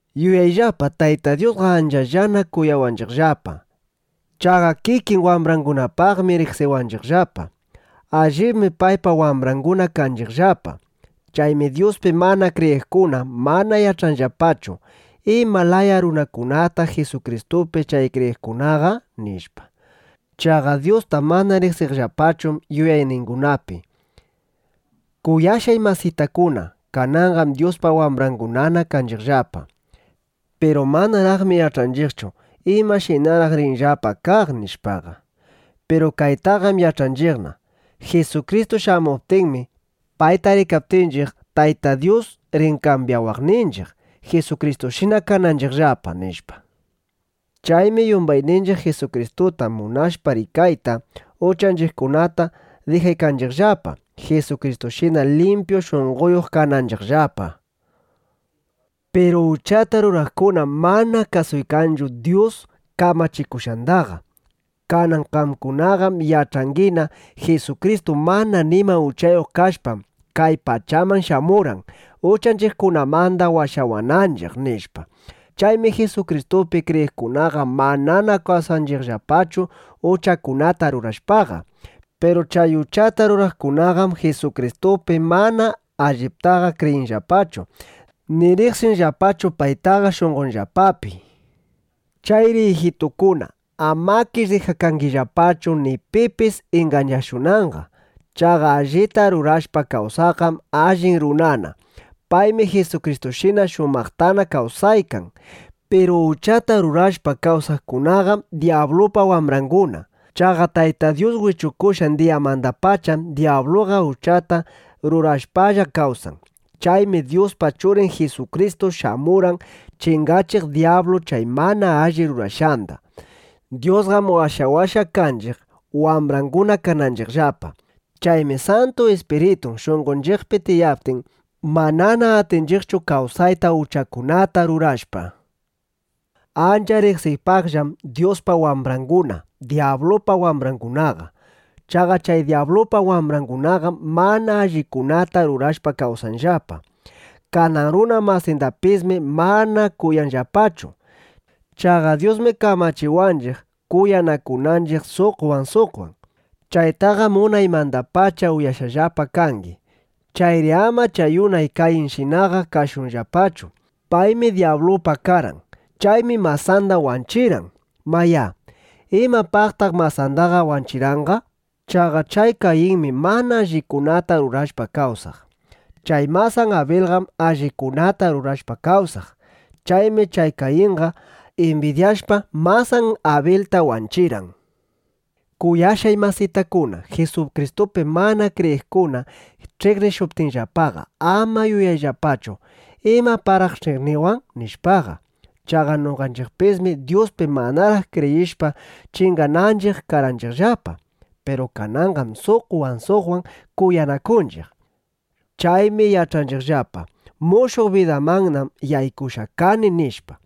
¡Yuyayllapa, Tayta Dyusqa anchallana kuyawanchiqllapa! Chaqa kikin wambrangunapaqmi riqsiwanchiqllapa. Allibmi paypa wambranguna kanchiqllapa. Chaymi Dyuspi mana kriyiqkuna mana yach'anllapachu: ¿Ima laya runakunataq Jisukristupi chay kriyiqkunaqa? nishpa. Chaqa Dyusta mana riqsinllapachu yuyayningunapi. Kuyashqay masitakuna, kananqam Dyuspa wambrangunana kanchiqllapa. Piru manaraqmi yach'anchiqchu: ¿Imashinaraq rinchiqllapa kaq? nishpaqa. Piru kaytaqam yach'anchiqna: Jisukristu shamuptinmi, payta rikaptinchiq, Tayta Dyus rin kambyawaqninchiq, Jisukristushina kananchiqllapa, nishpa. Chaymi yumbayninchiq Jisukristuta munashpa rikayta, uchanchiqkunata dijaykanchiqllapa, Jisukristushina limpyu shunqoyuq kananchiqllapa. Piru uchata ruraqkunam mana kasuykanchu Dyus kamachikushqandaqa. Kanan qamkunaqam yach'angina: Jisukristu mana nima uchayuq kashpam, kay pachaman shamurqan, uchanchiqkunamanda washawananchiq, nishpa. Chaymi Jisukristupi kriyiqkunaqa manana kawsanchiqllapachu uchakunata rurashpaqa. Piru chay uchata ruraqkunaqam Jisukristupi mana alliptaqa kriyinllapachu, ni riqsinllapachu paytaqa shunqonllapapi. Chayri ijitukuna, amakish dijakangillapachu, ni pipis ingañashunanqa. Chaqa allita rurashpa kawsaqqam allin runana. Paymi Jisukristushina shumaqtana kawsaykan. Piru uchata rurashpa kawsaqkunaqam dyablupa wambranguna. Chaqa Tayta Dyus wichukushqan diyamandapacham dyabluqa uchata rurashpalla kawsan. Chaymi Dyuspa Churin Jisukristu shamurqan chingachiq dyablu chay mana alli rurashqanda. Dyusqam washawashqa kanchiq, wambranguna kananchiqllapa. Chaymi Santu Ispiritun shunqonchiqpi tiyaptin, manana atinchiqchu kawsayta uchakunata rurashpa. Ancha riqsiypaqllam Dyuspa wambranguna, dyablupa wambrangunaqa. Chaqa chay dyablupa wambrangunaqam mana allikunata rurashpa kawsanllapa. Kanan runa masindapismi mana kuyanllapachu. Chaqa Dyusmi kamachiwanchiq, kuyanakunanchiq suqwan suqwan. Chaytaqam unaymandapacha uyashqallapa kangi. Chayri ama chay unay Kayinshinaqa kashunllapachu. Paymi dyablupa karqan. Chaymi masanda wanchirqan. Mayá, ¿imapaqtaq masandaqa wanchirqanqa? Chaqa chay Kayinmi mana allikunata rurashpa kawsaq. Chay masan Abilqam allikunata rurashpa kawsaq. Chaymi chay Kayinqa imbidyashpa, masan Abilta wanchirqan. Kuyashqay masitakuna, Jisukristupi mana kriyiqkuna ch'iqnishuptinllapaqa, ama yuyayllapachu: ¿Imapaqraq ch'iqniwan? nishpaqa. Chaqa noqanchiqpismi Dyuspi manaraq kriyishpa, chingananchiq karqanchiqllapa. Piru kananqam suqwan suqwan kuyanakunchiq. Chaymi yach'anchiqllapa: Mushuq bidamannam yaykushqa kani, nishpa.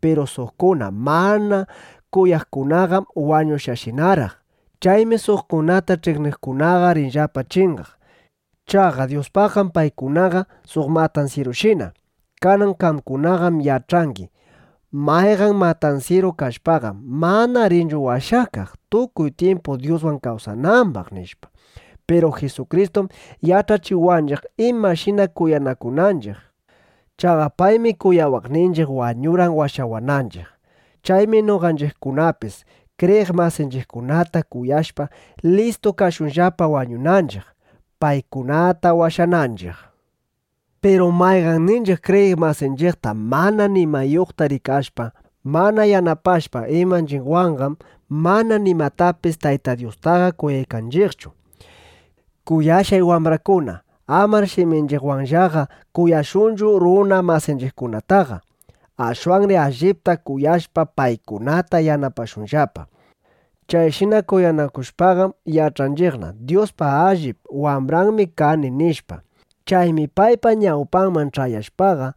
Piru suqkunata mana kuyaqkunaqam wañushqashinaraq. Chaymi suqkunata ch'iqniqkunaqa rinllapa chingaq. Chaqa Dyuspaqqam paykunaqa suq matansyirushina. Kanan qamkunaqam yach'angi: Mayqan matansyiru kashpaqam, mana rinchu washakaq, tukuy tyimpu Dyuswan kawsanambaq, nishpa. Piru Jisukristum yach'achiwanchiq imashina kuyanakunanchiq. Chaqa paymi kuyawaqninchiq wañurqan washawananchiq. Chaymi noqanchiqkunapis kriyiq masinchiqkunata kuyashpa, listu kashunllapa wañunanchiq, paykunata washananchiq. Piru mayqanninchiq kriyiq masinchiqta mana nimayuqta rikashpa, mana yanapashpa imanchiqwanqam, mana nimatapis Tayta Dyustaqa kuyaykanchiqchu. Kuyashqay wambrakuna, amar shiminchiqwanllaqa kuyashunchu runa masinchiqkunataqa. Ashwanri allipta kuyashpa, paykunata yanapashunllapa. Chayshina kuyanakushpaqam yach'anchiqna: Dyuspa allip wambranmi kani, nishpa. Chaymi paypa ñawpanman ch'ayashpaqa,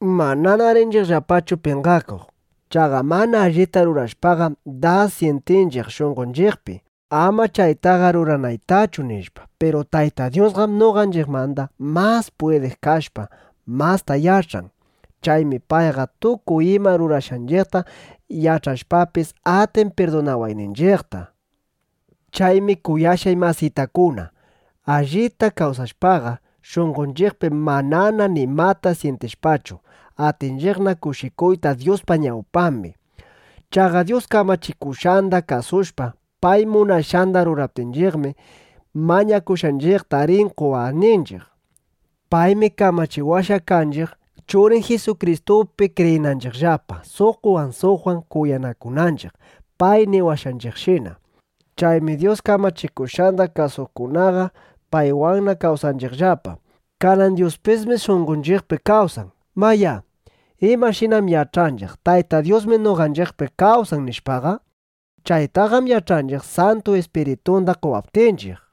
manana rinchiqllapachu penqakuq. Chaqa mana allita rurashpaqam, das syintinchiq shunqonchiqpi: Ama chaytaqa ruranaytachu, nishpa. Piru Tayta Dyusqam noqanchiqmanda mas pwidiq kashpa, masta yach'an. Chaymi payqa tukuy ima rurashqanchiqta yach'ashpapis, atin pirdunawayninchiqta. Chaymi kuyashqay masitakuna, allita kawsashpaqa, shunqonchiqpi manana nimata syintishpachu, atinchiqna kushikuyta Dyuspa ñawpambi. Chaqa Dyus kamachikushqanda kasushpa, pay munashqanda ruraptinchiqmi, mañakushqanchiqta rin qowaqninchiq. Paymi kamachiwashqa kanchiq, Churin Jisukristupi kriyinanchiqllapa, suqwan suqwan kuyanakunanchiq, pay niwashqanchiqshina. Chaymi Dyus kamachikushqanda kasuqkunaqa paywanna kawsanchiqllapa. Kanan Dyuspismi shunqonchiqpi kawsan. Mayá, ¿imashinam yach'anchiq: Tayta Dyusmi noqanchiqpi kawsan, nishpaqa? Chaytaqam yach'anchiq, Santu Ispiritunda qowaptinchiq.